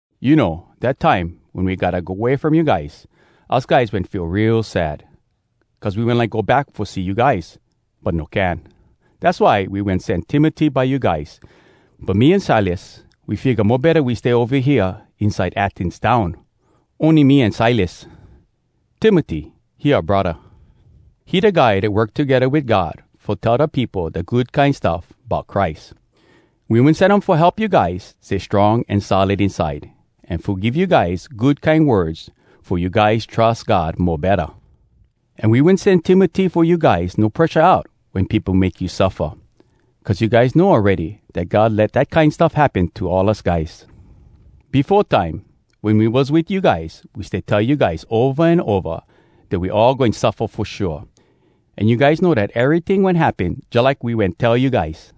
You know, dat time wen we gotta go way from you guys, us guys wen feel real sad, cuz we wen like go back fo see you guys, but no can. Dass why we wen sen Timoty by you guys. But me an Silas, we figga mo betta we stay ova hea inside Athens town, ony me an Silas. Timoty, he oua braddah. He da guy dat work togedda wit God fo tell da peopo da Good Kine Stuff Bout Christ. We wen sen um fo help you guys stay strong an solid inside, an fo give you guys good kine words fo you guys trus God mo betta. An we wen sen Timoty fo you guys no presha out wen peopo make you suffa. Cuz you guys know awready dat God let dat kine stuff happen to all us guys. Befo time, wen we was wit you guys, we stay tell you guys ova an ova dat we all goin suffa fo shua. An you guys know dat eryting wen happen jalike we wen tell you guys.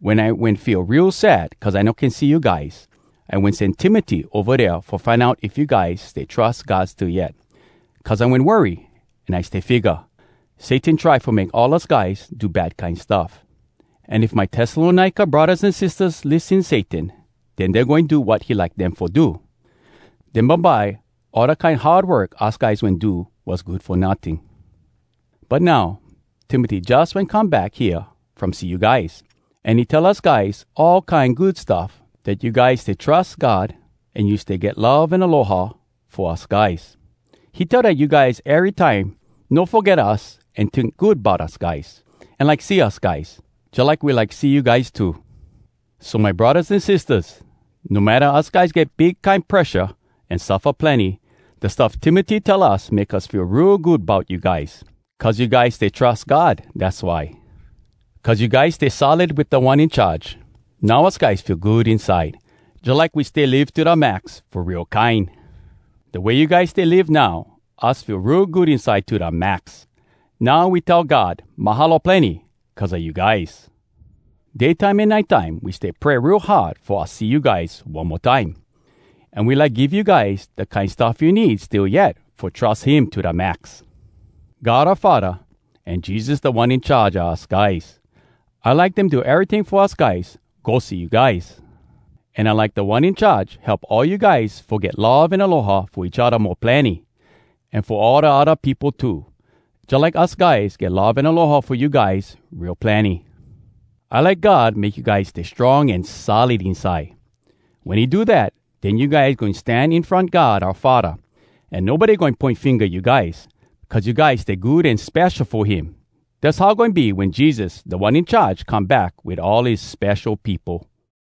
Wen I wen feel real sad cuz I no can see you guys, I wen sen Timoty ova dea fo find out if you guys stay trus God still yet. Cuz I wen worry, an I stay figga, “Satan try fo make all us guys do bad kine stuff. An if my Tessalonika braddahs an sistahs lissen Satan, den dey goin do wat he like dem fo do. Den bumbye all da kine hard work us guys wen do was good fo notting.” But now, Timoty jus wen come back hea from see you guys, an he tell us guys all kine good stuff: dat you guys stay trus God, an you stay get love an aloha fo us guys. He tell dat you guys erytime no foget us an tink good bout us guys, an like see us guys, jalike we like see you guys too! So, my braddahs an sistahs! No matta us guys get big kine presha an suffa plenny, da stuff Timoty tell us make us feel real good bout you guys. Cuz you guys stay trus God, dass why. Cuz you guys stay solid wit Da One In Charge, now us guys feel good inside, jalike we stay live to da max fo real kine! Da way you guys stay live now, us feel real good inside to da max! Now we tell God “Mahalo plenny” cuz a you guys. Day time an nite time we stay pray real hard fo us see you guys one mo time, an we like give you guys da kine stuff you need still yet fo trus him to da max. God Oua Faddah an Jesus Da One In Charge a us guys. I like dem do eryting fo us guys go see you guys. An I like Da One In Charge help all you guys fo get love an aloha fo each odda mo plenny, an fo all da odda peopo too, jalike us guys get love an aloha fo you guys real plenny. I like God make you guys stay strong an solid inside. Wen he do dat, den you guys goin stan in front God oua Faddah, an nobody goin poin finga you guys, cuz you guys stay good an spesho fo him! Dass how goin be wen Jesus, Da One In Charge, come back wit all his spesho peopo.